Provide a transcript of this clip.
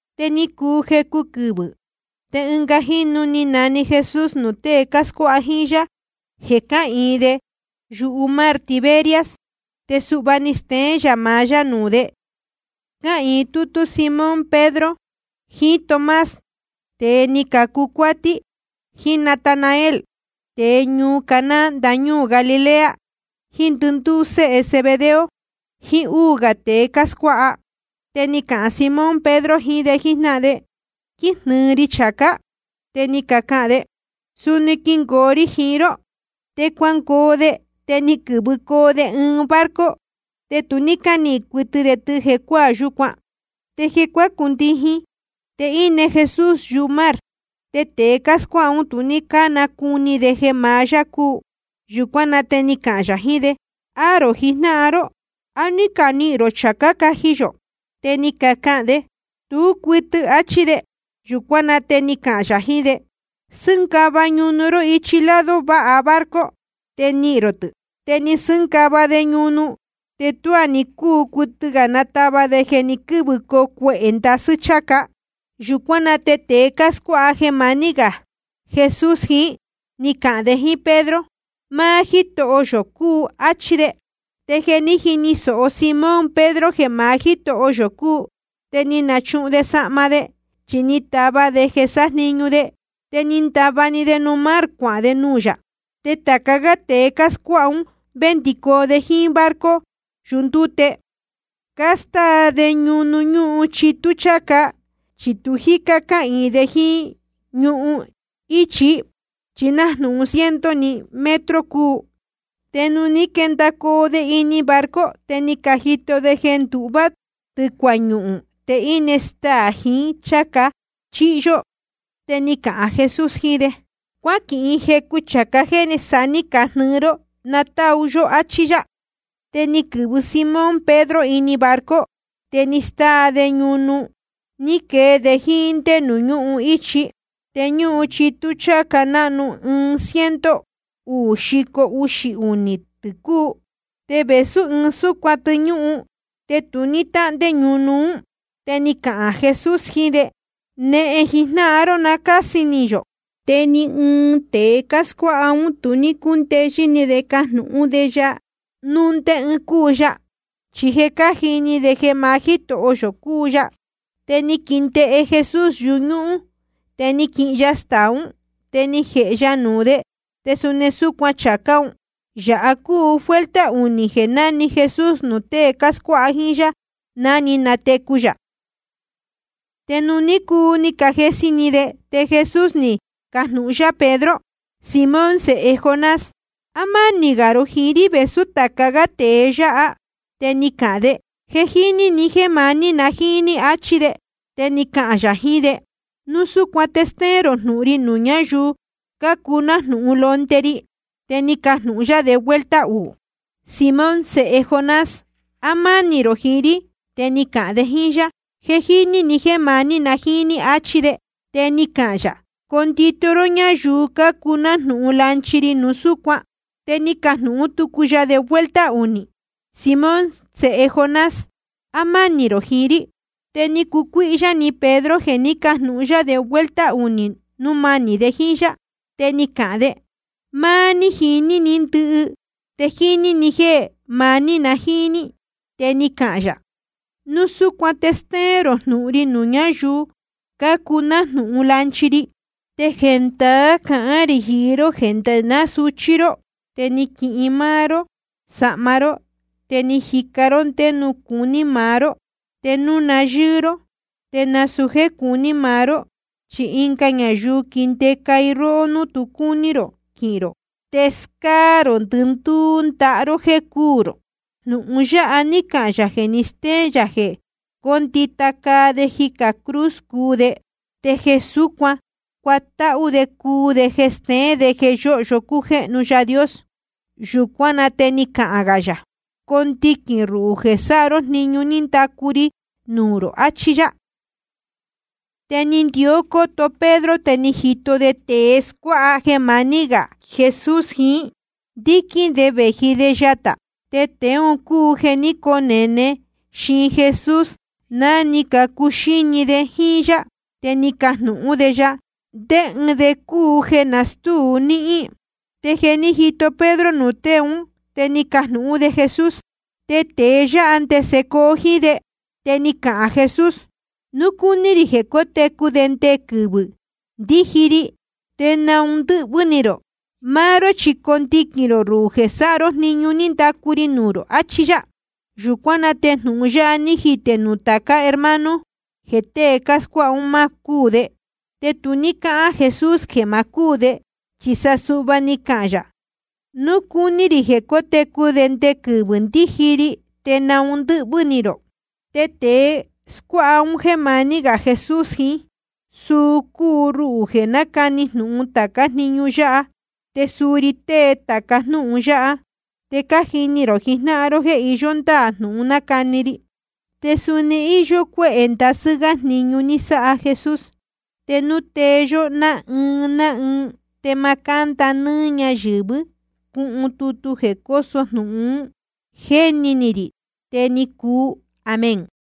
Te ni cuu jecu quɨvɨ̄, te ɨnga jínu ni nane Jesús nuū tée cáscuáha jíín yá, jeē cáhīin de yumar Tiberias. Te suhva ni steén yā maá yá nuū de: Cáhīin tútú Simón Pedro, jiín Tomás, tēe ni cacu cuátí, jiín Natanael, tēe ñuu Caná ndañúū Galilea, jiín ndɨndúú séhe Zebedeo, jiín úū gā tēe cáscuáha. Te ni cahān Simón Pedro jiín de jíjnáhan de: Quíjnɨɨ ri chācá. Te ni cacahān de: Suni quingoo ri jiín ró. Te cuangoo de, te ni quɨ̄vɨcoo de ɨɨn barco. Te tu ní cánihīn cuɨtɨ de tɨ jecuáā yúcuan. Te jeē cuácundijin, te íne Jesús yumar. Te tēe cáscuáha ún, tu ní cánacuni de jeē maá yá cúu. Yūcuán na te ni cahān yā jiín de: Aá rō jijnáhan ró, ¿á ní canihīn rō chācá caji yō? Te ni cacahān de: Tú cuɨtɨ, achí de. Yūcuán na te ni cahān yā jiín de: Sɨ́ngava ñunu ró ichi lado váha barco, te nihīn rō tɨ̄. Te ni casɨ́ngava de ñunu, te tuá ní cúu cuɨtɨ natava de, jeē ni quɨ́vɨcoo cuehē ndasɨ́ cháca. Yūcuán na te tēe scuáha jeē maní gā Jesús jiín, ní cahān de jíín Pedro: Máá Jítoho yō cúu, áchí de. Te jeē ní jini sōho Simón Pedro jeē maá Jítoho yō cúu, te ni nachuhun de sahma de, chi ni tava de jeē sájniñu de. Te ni ndava‑ni de nuū mar cuahān de nuū yā. Te tāca gá tēe cáscuáha ún, vendicoo de jíín barco yundúte, cástáa de ñunu ñúhun chitú cháca. Chi tu jícá cáhīin de jíín ñuhun íchi, chi nájnūhun ciento‑ni metro cúu. Te nuū ní quendacoo de ini barco, te ni cajito de jeē nduhvá tɨ̄cua ñuhūn, te íne staā jiín ɨɨn chācá chíhyó. Te ni cahān Jesús jiín de: Cuáquihin jecu chācá jéē sa ní cajnɨɨ ró, na táu yó, áchí yá. Te ni quɨ̄vɨ Simón Pedro ini barco, te ni stáa de ñunu, ni quee de jíín ndé nuū ñúhun íchi. Te ñúhun chitú cháca náhnu, ɨɨn ciento uū xico uxī unī tɨ̄ cúu. Te vēsú ɨɨn súcuan tɨ ñúhun, te tu ní táhndé ñunu. Te ni cahān Jesús jiín de: Nehen jijnáhan ró na cási ni yō. Te ni ɨɨn tēe cáscuáha ún tu ní cúndeyɨ́ ni de cajnūhún de ya núu ndé ɨɨn cúu ya. Chi je cájini de jeē maá Jítoho yō cúu ya. Te ni quindēhe Jesús yuñúhún, te ni quihin ya staā ún, te ni jēhe ya nuū de, te suni súcuan chācá un. Yāha cúu vuelta unī jeē ní nane Jesús nuū tée cáscuáha jíín yá, ná ni natecu yā. Te nuū ní cuu ni cajesi ni de, te Jesús ni cajnūhun yá Simón Pedro: Simón sēhe Jonás, ¿á mánī gā rō jiín rí vēsú tāca gá tēe yáha? Te ni cahān de: Je jíní ni jéē maní na jíín ní, achí de. Te ni cahān yā jiín de: Núu súcuan te stéén rō jnūhun ri nuū ñáyuu cácuu nájnūhun londe ri. Te ni cajnūhun yá de vuelta uū: Simón sēhe Jonás, ¿á mánī rō jiín rí? Te ni cahān de jíín yá: Je jíní ni jéē maní na jíín ní, achí de. Te ni cahān yā: Condito ró ñáyuu cácuu nájnūhun lanchi ri núu súcuan. Te ni cajnūhún tucu ya de vuelta unī: Simón sēhe Jonás, ¿á mánī rō jiín rí? Te ni cucuíhyá ni Pedro jeē ní cajnūhun yá de vuelta unī núu manī de jíín yá. Te ni cahān de: Máá ní jiní ni ndɨhɨ, te jíní ni jéē maní na jíín ní. Te ni cahān yā: Núu súcuan te stéén rō jnūhun ri nuū ñáyuu cácuu nájnūhun lanchi ri. Te jendaá cahán rī jiín ró jeē nde ná suchí ró, te ni quihin máá ró sahma ró, te ni jica ró ndé nuū cuní maá ró. Te núu na yɨ́ɨ ró, te nasūu jéē cuní maá ró, chi ɨnga ñayuu quindēca i róhó nuū tu cúní rō quihīn rō. Te scáá rō ndɨndúú ndaha ró jéē cuu rō. Jnūhun yáha ní cahān yā jeē ni stéén yā jeē cóndita caa de jicā cruz cuu de, te jeē súcuan cuatáhú de cúu jeē steén de jeē yóhyo cújéhnu Yaā Dios. Yūcuán na te ni cahān gā yā: Condiquīn rō ruhū jeē sáha ró jniñu ní ndacu ri nuū rō, achí yá. Te ni ndió cóto Pedro, te ni jito de tēe scuáha jeē maní gā Jesús jiín, ndíquín de vēji de yatā. Tēe un cúu jeē ní conene xiin Jesús ná ni cacuxíni de jíín yá, te ni cajnūhún de ya: ¿Ndé ɨɨn de cúu jeē nastúu níhín? Te jeē ní jito Pedro nuū tée ún, te ni cajnūhún de Jesús: Te tēe yáha, ¿ndese coo jíín de? Te ni cahān Jesús: Núu cúní rī jeē cótecu de nde quɨvɨ̄ ndíji ri, ¿te naun ndɨ́hvɨ́ ni rō? Máá ró chi condiquīn rō ruhū jeē sáha ró jniñu ní ndacu ri nuū rō, achí yá. Yūcuán na te jnūhun yáha ní jitē núu nuū tācá hermano, jeē tée scuáha un má cúū de. Te tu ní cáhán Jesús jeē ma cúū de, chi sa suhva ni cahān yā: Núu cúní rī jeē cótecu de nde quɨvɨ̄ ndíji ri, ¿te naun ndɨ́hvɨ́ ni rō? Te tēe scuáha un jéē maní gā Jesús jiín, suu cúu ruhū jeē nácani jnūhun tācá jniñu yáha, te suu ri tée tāca jnúhun yáha. Te cájini rō jijnáhan ró jéē iyó ndáā jnūhun nácani ri. Te suni íyó cuéhē ndasɨ́ gá jniñu ní sáha Jesús. Te núu tee yó ná ɨɨn ná ɨɨn, te ma cánda nɨ́ɨ́ ñáyɨ̄vɨ́ cuhun tutu jeē cóso jnūhun ún, jéni ni rī. Te ni cuu. Amén.